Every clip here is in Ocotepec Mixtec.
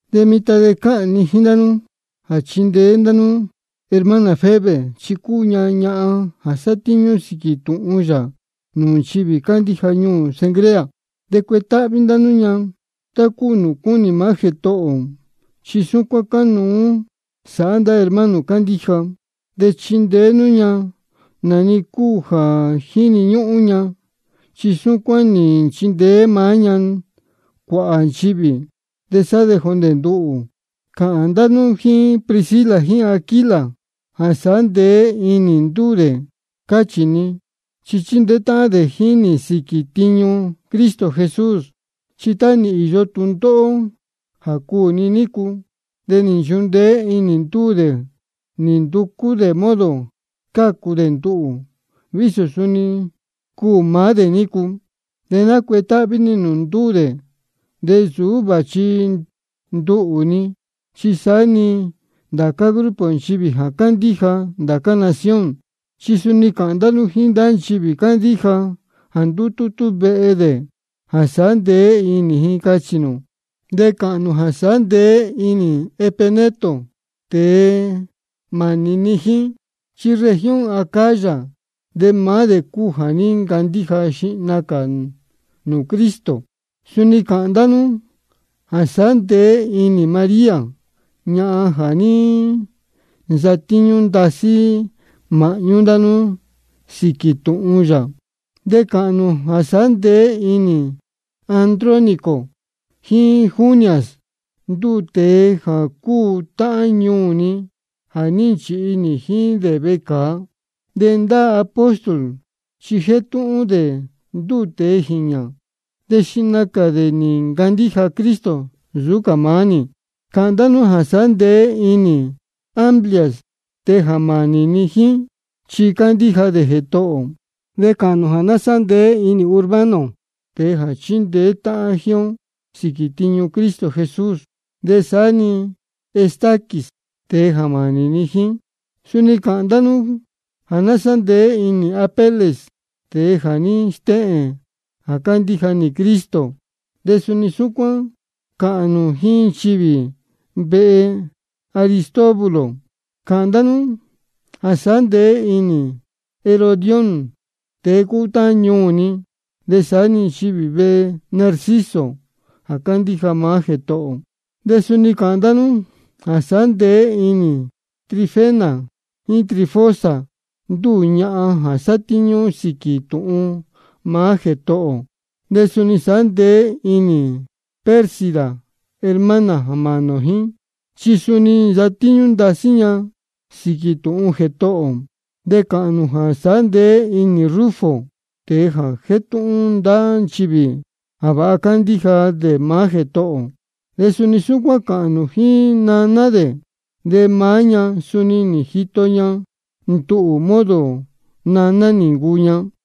De mitan de cáhān ni jíín ndá nú jā chindeé nú hermana Febe, chi cúu ña ñahan jā sátíñú sīquī tūhun yā nūū nchivī cándíja ñuū Cencrea. De cuetáhví ndá nú ña tá cúu nūū cúnī maá Jētohō ō, chi súcuán cánuú sāhá ndá hermano cándíja. De chindeé nú ña nā-ni cuá cúu jā jíni ñúhún ña, chi súcuán nī nchindeé maá ña cuāhā nchivī, de saá-ni jondē nduhū. Cāhān ndá nú jíín Priscila jíín Aquila jā sāhá ndeé inī ndúū dē, cáchī ni, chi chíndeé táhán dē jíín nī sīquī tiñu Cristo Jesús. Chi tá nī īyo tūndóhó jā cuū ni nícu, de nī nchundeé inī ndúū dē nī nducú dē modo scácu dē nduhū, vísō suni cuū maá dē nícu. De nácuetáhví nī nūū ndúū dē, de nsūú vāchi nduhū-ni, chi saá-ni ndācá grupo nchivī jā cándíja ndācá nación. De suni cāhān ndá nú jíín ndá nchivī cándíja jā ndútútú vehe dē, jā sāhá ndeé inī ji, cáchī ni. De cāhān nū jā sāhá ndeé inī Epeneto, tēe jā mānī ni jíín. Chi región Acaya de maá dē cúu jā ní ncandíja xihna cā nūū Cristo. Suni cāhān ndá nú jā sāhá ndeé inī María, ñahan jā ní nsatíñú ndasí māhñú ndá nú sīquī tūhun yā. De cāhān nū jā sāhá ndeé inī Andrónico jíín Junias, ndúū tēe jā cúu táhán ñuū ni jā ní nchīhi nī jíín dē vecāa. De ndá apóstol chi jétúhún dē ndúū tēe jīñā, de xihna cā dē nī ncandíja Cristo nsūú cā maá nī. Cāhān ndá nú jā sāhá ndeé inī Amplias, tēe jā mānī ni jíín, chi cándíja dē Jētohō ō. De cāhān nū jā sāhá ndeé inī Urbano, tēe jā chíndeé táhán jíín ó sīquī tiñu Cristo Jesús, de saá-ni Estaquis, tēe jā mānī ni jíín. Suni cāhān ndá nú jā sāhá ndeé inī Apeles, tēe jā ní stéhēn jā cándíja nīhin dē Cristo, de suni súcuán cāhān nū jíín nchivī vehe Aristóbulo. Cāhān ndá nú jā sāhá ndeé inī Herodión, tēe cúu táhán ñuū ni. De saá-ni nchivī vehe Narciso jā cándíja maá Jētohō ō. De suni cāhān ndá nú jā sāhá ndeé inī Trifena jíín Trifosa, ndúū ñahan jā sátíñú sīquī tūhun maá Jētohō ō. De suni sāhá ndeé inī Pérsida, hermana jā mānī ō jíín, chi suni nī nsatíñú ndasí ña sīquī tūhun Jētohō ō. De cāhān nū jā sāhá ndeé inī Rufo, tēe jā jétúhún ndá nchivī jā vāha cándíja dē maá Jētohō ō. De suni súcuán cāhān nū jíín naná dē, de maá ña suni nī jito ña nduhū modo jā naná nī cúu ña.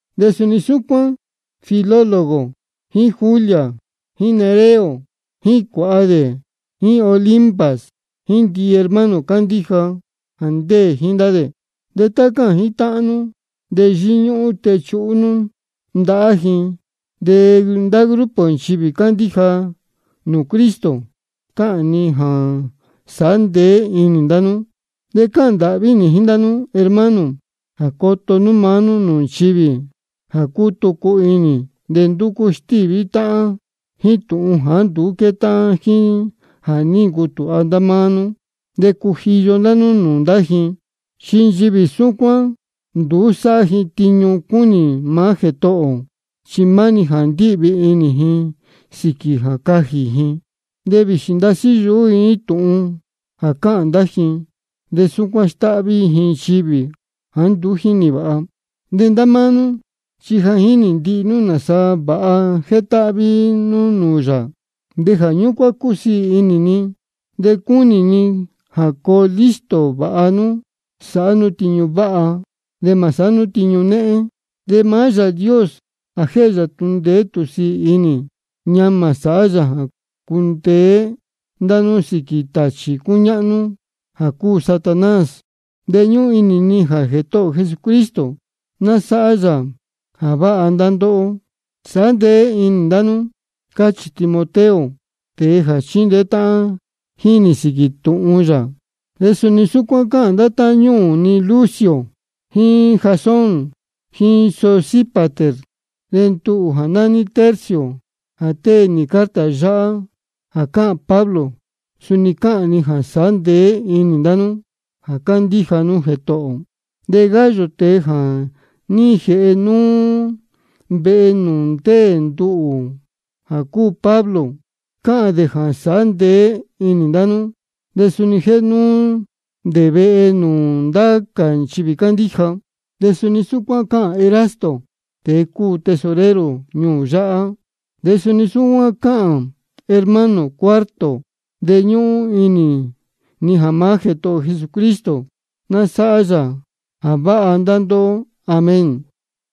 De suni súcuán Filólogo jíín Julia jíín Nereo jíín cuāha dē, jíín Olimpas jíín ndihi hermano cándíja jā ndéē jíín ndá dē. De tá cáhān jítáhán nú, de yíñúhún techuhú nú ndahá ji. De ndācá grupo nchivī cándíja nūū Cristo, cáhān ji jā sāhá ndeé inī ndá nú. De cáhān ndāhví nī jíín ndá nú, hermano, jā coto nú maá nú nūū nchivī jā cútucu inī de ndúcú stíví táhán jíín tūhun jāá nduú quétáhán jíín jā ní ncutūha ndá nú. De cujiyo ndá nú nūū ndá ji. Chi nchivī súcuán, nduú sáhá ji tiñu cúnī maá Jētohō ō, chi maá-ni jā ndíhvī inī ji sīquī jā cajī ji. De vīxī ndasí yuhú ji jíín tūhun jā cáhān ndá ji, de súcuán stáhví ji nchivī jāá nduú jínī vāha. De ndá máá nú chi ja jínī ndihi nchivī nāsa vāha jétáhví nú nūū yā, de jā ñúcuán cúsiī inī ni. De cúnī ni jā coo listo vāha nú sāhá nú tiñu váha, de mā sāhá nú tiñu néhén. De maá Yāā Dios jā jéhe tūhun ndeé tūhun sīī inī, ñamā sāhá yā jā cundeé ndá nú sīquī tāchī cúñáhnú jā cúu Satanás. De ñúhún inī ni jā Jētohō ō Jesucristo ná sáhá yā jā váha ndá ndóhó. Sāhá ndeé inī ndá nú, cáchī Timoteo, tēe jā chíndeé táhán jíín nī sīquī tūhun yā. De suni súcuán cáhān ndá táhán ñuū ni Lucio jíín Jasón jíín Sosípater. De nduhū jā nání Tercio, jā tée nī carta yáhá jā cáhān Pablo, suni cáhān ni jā sāhá ndeé inī ndá nú jā cándíja nú Jētohō ō. De Gayo, tēe jā ní jēhe núú vehe nūū ndéē nduhū jā cúu Pablo, cáhān dē jā sāhá ndeé inī ndá nú. De suni jéhe núú dē vehe nūū ndācá nchivī cándíja. De suni súcuán cáhān Erasto, tēe cúu tesorero ñuū yáhá, de suni súcuán cáhān hermano Cuarto. De ñúhún inī ni jā maá Jētohō ō Jesucristo ná sáhá yā jā váha ndá ndóhó. Amén.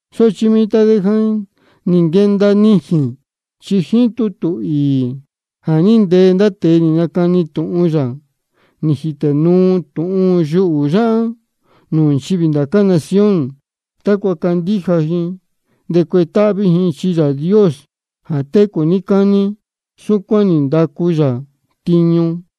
Sochi mitan de ja nī nquenda nijīn. Chi jíín tutū īī jā ní ntee ndá tēe nī nacani tūhun yā, nī jītē nuu tūhun yuhū yáhá nūū nchivī ndācá nación, tácua candíja ji de cuetáhví ji. Chi Yāā Dios jā técū níí cání, súcuán nī ndacu yā tiñu.